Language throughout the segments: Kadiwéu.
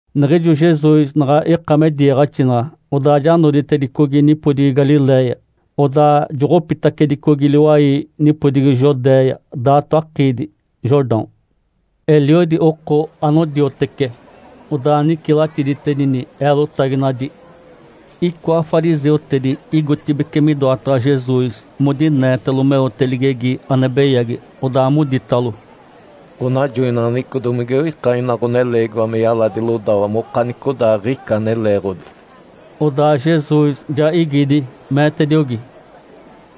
Niɡ̶ijo Jesus naɡ̶a ika me diiɡ̶axinaɡ̶a, odaa ja noditedicogi nipodigi Galiléia, odaa joɡ̶opitacedicogi liwai nipodigi Judéia, daato akiidi Jordão. Eliodi oko anodiotece, odaa nicilatiditedini eelotaginadi. Icoa fariseutedi igotibeci midoataɡ̶a Jesus modineetalo meote ligegi ane beyagi. Odaa moditalo, “Ǥonajoinaɡ̶aneɡ̶eco domige oika ina ɡ̶oneleegiwa me yaladi lodawa mokanicodaaɡ̶ica ane leeɡ̶odi?” Odaa Jesus ja igidi, meetediogi,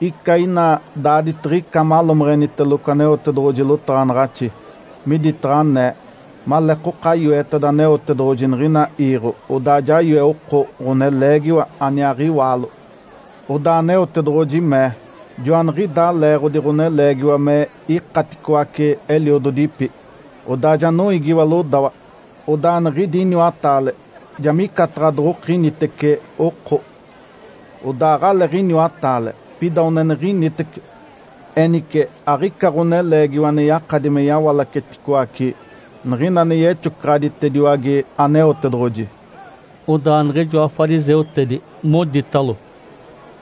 “Ica ina daaditiɡ̶ica malomeɡ̶eniteloco Aneotedoɡ̶oji lotaɡ̶anaɡ̶axi, miditaɡ̶a anee, ‘Maleekoka yoeteda Aneotedoɡ̶oji niɡ̶ina iiɡ̶o, odaa ja yoe oko, ɡ̶oneleegiwa aniaaɡ̶iwaalo.’ Odaa Aneotedoɡ̶oji mee, ‘Joaniɡ̶idaa leeɡ̶odi ɡ̶oneleegiwa me ikaticoace eliododipi, odaa ja noiigiwa lodawa, odaa niɡ̶idi iniwataale ja micataɡ̶a doɡ̶okinitece oko.’ Odaa aɡ̶aleeɡ̶iniwataale, pida oneniɡ̶initeci. Enice aɡ̶ica ɡ̶oneleegiwa ane yakadi me yawalaceticoace niɡ̶ina ane yexocaɡ̶aditediwage Aneotedoɡ̶oji.” Odaa niɡ̶ijoa fariseutedi moditalo,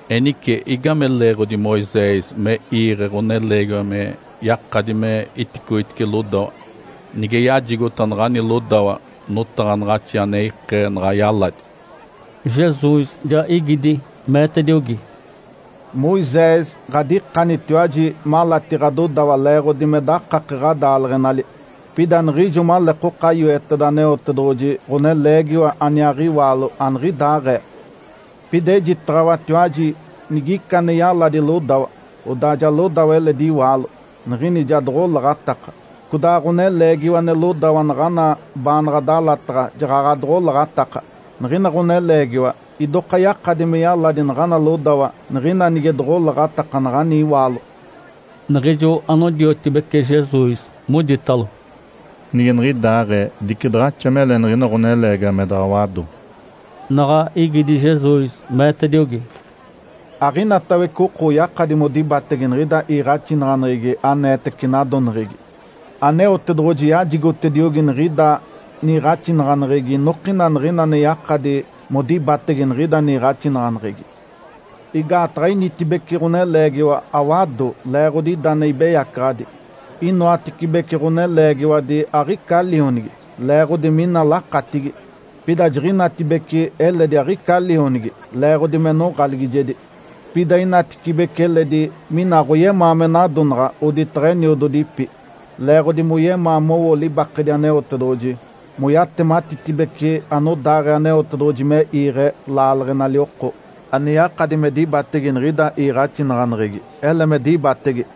“Enice, igame leeɡ̶odi Moisés me iiɡ̶e ɡ̶oneleegiwa me yakadi me iticoitice lodawa nige yajigota naɡ̶ani lodawa notaɡ̶anaɡ̶axi ane ikee naɡ̶a yaladi?” Jesus ja igidi, meetediogi, “Moisés ɡ̶adikanitiwaji malati ɡ̶adodawa leeɡ̶odi me dakake ɡ̶adaaleɡ̶enali. Pida niɡ̶ijo maleekoka yoeteda Aneotedoɡ̶oji ɡ̶oneleegiwa aniaaɡ̶iwaalo, aniɡ̶idaaɡ̶ee. Pida ejitaɡ̶awatiwaji nigica ane yaladi lodawa, odaa ja lodawa eledi iwaalo, niɡ̶ini ja doɡ̶olaɡ̶ataka. Codaa ɡ̶oneleegiwa ane lodawa naɡ̶ana baanaɡ̶a dalataɡ̶a jaɡ̶aɡ̶a doɡ̶olaɡ̶ataka. Niɡ̶ina ɡ̶oneleegiwa idoka yakadi me yaladi naɡ̶ana lodawa niɡ̶ina nige doɡ̶olaɡ̶ataka naɡ̶ani iwaalo.” Niɡ̶ijo anodiotibece Jesus moditalo, “Nige niɡ̶idaaɡ̶ee, dice daɡ̶axa mele niɡ̶ina ɡ̶oneleegiwa me daɡ̶a wado.” Naɡ̶a igidi Jesus, meetediogi, “Aɡ̶inatawece oko oyakadi modibatege niɡ̶ida iiɡ̶axinaɡ̶aneɡ̶egi aneetece nadoneɡ̶egi. Aneotedoɡ̶oji yajigotediogi niɡ̶ida niiɡ̶axinaɡ̶aneɡ̶egi inokina niɡ̶ina ane yakadi modibatege niɡ̶ida niiɡ̶axinaɡ̶aneɡ̶egi. Igaataɡ̶a initibece ɡ̶oneleegiwa awado leeɡ̶odi ida ane ibeyacaɡ̶adi. Inoatecibece ɡ̶oneleegiwadi aɡ̶ica lionigi, leeɡ̶odi mina lakatigi. Pida jiɡ̶inatibece eledi aɡ̶ica lionigi leeɡ̶odi me noɡ̶aligijedi. Pida inatecibece eledi mina aɡ̶oyemaa me nadonaɡ̶a oditaɡ̶a eniododipi, leeɡ̶odi moyemaa mowo libakedi Aneotedoɡ̶oji, moyatematitibece anodaaɡ̶ee Aneotedoɡ̶oji me iiɡ̶e laaleɡ̶enali oko. Ane yakadi me dibatege niɡ̶ida iiɡ̶axinaɡ̶aneɡ̶egi, ele me dibatege!”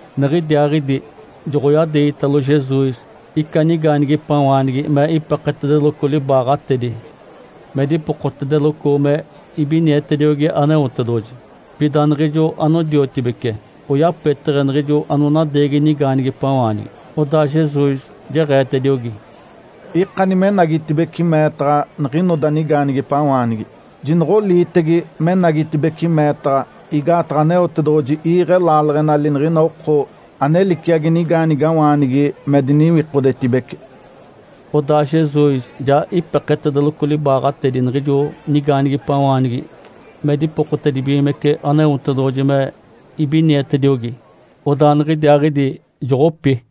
Niɡ̶idiaaɡ̶idi joɡ̶oyadeegitalo Jesus ica nigaanigipawaanigi me ipeketedeloco libaaɡ̶atedi me dipokotedeloco me ibinietediogi Aneotedoɡ̶oji. Pida niɡ̶ijo anodiotibece oyapeteɡ̶e niɡ̶ijo anonadeegi nigaanigipawaanigi. Odaa Jesus jeɡ̶eetediogi, “Ikani menagitibeci meetaɡ̶a niɡ̶inoda nigaanigipawaanigi, jinoɡ̶oliitege menagitibeci meetaɡ̶a, igaataɡ̶a Aneotedoɡ̶oji iiɡ̶e laaleɡ̶enali niɡ̶ina oko ane liciagi nigaanigawaanigi me diniwikodetibece.” Odaa Jesus ja ipeketedeloco libaaɡ̶atedi niɡ̶ijo nigaanigipawaanigi me dipokotedibigimece Aneotedoɡ̶oji me ibinietediogi. Odaa niɡ̶idiaaɡ̶idi joɡ̶opi.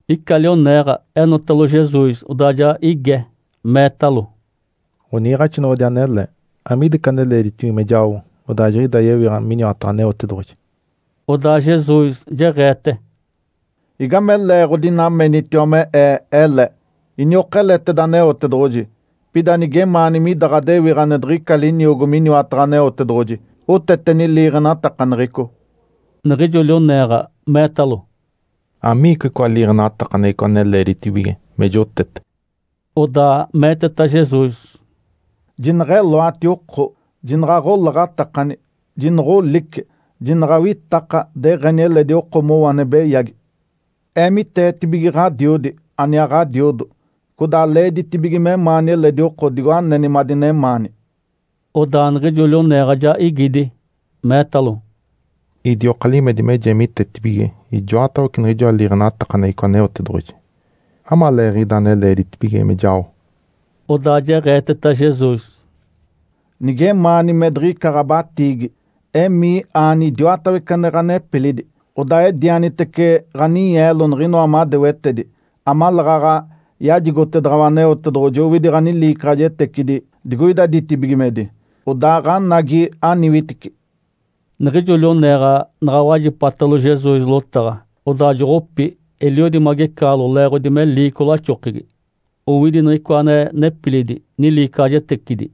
Ica lioneeɡ̶a enotalo Jesus, odaa ja ige, meetalo, “Ǥoniiɡ̶axinoɡ̶odi anele, amiida ica ane leeditibige me jao, odaa jiɡ̶idaa yewiɡ̶a miniwataɡ̶a Aneotedoɡ̶oji?” Odaa Jesus jeɡ̶eete, “Igame leeɡ̶odi ina menitiwa me Ee ele? Iniokeleteda Aneotedoɡ̶oji. Pida nigemaani mida ɡ̶adewiɡ̶a ane diɡ̶ica liniogo miniwataɡ̶a Aneotedoɡ̶oji, oteteni liiɡ̶enatakaneɡ̶eco.” Niɡ̶ijo lioneeɡ̶a meetalo, “Amiicoa icoa liiɡ̶enatakaneɡ̶eco ane leeditibige me jotete?” Odaa meeteta Jesus, “Jineɡ̶eloati oko, jinaɡ̶a aɡ̶olaɡ̶atakani, jinoɡ̶olice, jinaɡ̶a awitaka deɡ̶eni eledi oko mowo ane beyagi! Eemiteetibige ɡ̶adiodi, aniaa ɡ̶adiodo, codaa leeditibige memaani eledi oko digo aneni madinemaani.” Odaa niɡ̶ijo lioneeɡ̶a ja igidi, meetalo, “Idioka limedi me jeemitetibige ijoatawece niɡ̶ijoa liiɡ̶enatakaneɡ̶eco Aneotedoɡ̶oji. Amaleeɡ̶ida ane leeditibige me jao?” Odaa jeɡ̶eeteta Jesus, “Nigemaani me diɡ̶ica ɡ̶abatiigi, emii, aani idiwatawece ane ɡ̶anepilidi, odaa edianitece ɡ̶aninyeelo niɡ̶inoa madewetedi, amaleeɡ̶aɡ̶a yajigotedaɡ̶awa Aneotedoɡ̶oji owidi ɡ̶aniliicaɡ̶ajetecidi digoida ditibigimedi. Odaaɡ̶anagi, aniwitici!” Niɡ̶ijo lioneeɡ̶a naɡ̶a wajipatalo Jesus lotaɡ̶a, odaa joɡ̶opi, eliodi magecaɡ̶alo, leeɡ̶odi me liico laxokegi, owidi niɡ̶icoa ane nepilidi niliicaɡ̶ajetecidi.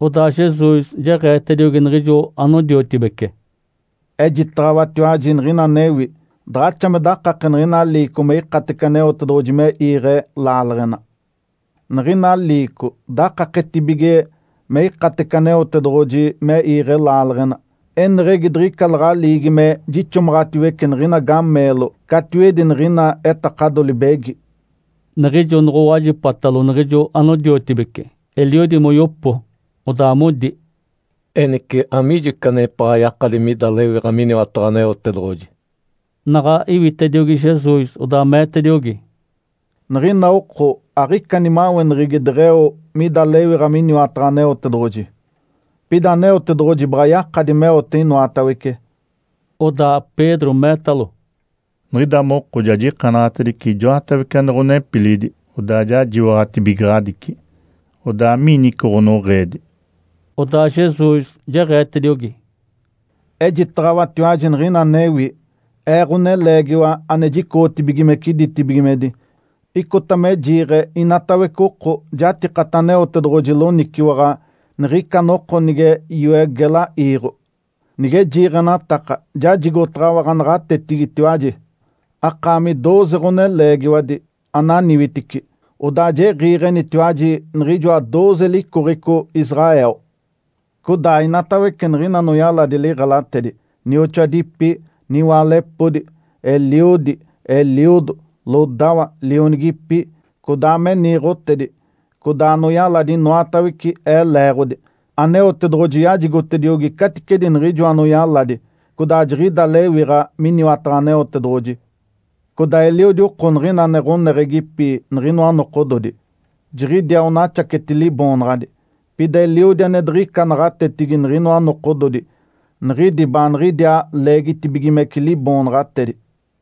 Odaa Jesus jeɡ̶eetediogi niɡ̶ijo anodiotibece, “Ejitaɡ̶awatiwaji niɡ̶ina anewi. Daɡ̶axa me dakake niɡ̶ina liico me ikatece Aneotedoɡ̶oji me iiɡ̶e laaleɡ̶ena. Niɡ̶ina liico dakaketibige me ikatece Aneotedoɡ̶oji me iiɡ̶e laaleɡ̶ena, eneɡ̶egi diɡ̶ica laɡ̶aliigi me jixomaɡ̶atiwece niɡ̶ina gameelo catiwedi niɡ̶ina etakado libegi.” Niɡ̶ijo noɡ̶owajipatalo niɡ̶ijo anodiotibece, eliodi moyopo, odaa modi, “Enice, amiijo ica anepaɡ̶a yakadi mida lewiɡ̶a miniwataɡ̶a Aneotedoɡ̶oji?” Naɡ̶a iwitediogi Jesus, odaa meetediogi, “Niɡ̶ina oko aɡ̶ica nimaweneɡ̶egi deɡ̶eo mida lewiɡ̶a miniwataɡ̶a Aneotedoɡ̶oji. Pida Aneotedoɡ̶oji baɡ̶a yakadi meote inoatawece.” Odaa Pedro meetalo, “Niɡ̶ida moko ja jikanaɡ̶atedice ijoatawece ane ɡ̶onepilidi, odaa ja jiwaɡ̶atibigaɡ̶adici. Odaa, amigini ica ɡ̶onoɡ̶eedi?” Odaa Jesus jeɡ̶eetediogi, “Ejitaɡ̶awatiwaji niɡ̶ina anewi. Ee, Ǥoneleegiwa ane jicoɡ̶otibigimece ditibigimedi, icota me jiiɡ̶e inatawece oko jatikata Aneotedoɡ̶oji loniciwaɡ̶a niɡ̶ica noko nige yoe gela iiɡ̶o. Nige jiiɡ̶enataka, jajigotaɡ̶awa ɡ̶anaɡ̶atetigitiwaji, akaami dooze ɡ̶oneleegiwadi, ananiwitici. Odaa jiɡ̶iiɡ̶enitiwaji niɡ̶ijoa dooze licoɡ̶eco Israel. Codaa inatawece niɡ̶ina anoyaladi liɡ̶elatedi, nioxoadipi, niwaalepodi, eliodi, eliodo, lodawa, lionigipi, codaa me niiɡ̶otedi, codaa anoyaladi inoatawece, Ee leeɡ̶odi, Aneotedoɡ̶oji yajigotediogi caticedi niɡ̶ijoa anoyaladi. Codaa jiɡ̶ida lewiɡ̶a miniwataɡ̶a Aneotedoɡ̶oji. Codaa eliodi oko niɡ̶ina ane ɡ̶oneɡ̶egipi niɡ̶inoa nokododi, jiɡ̶idiaa onaxaceti liboonaɡ̶adi. Pida eliodi ane diɡ̶ica naɡ̶atetigi niɡ̶inoa nokododi, niɡ̶idi baaniɡ̶idiaa leegitibigimece liboonaɡ̶atedi.”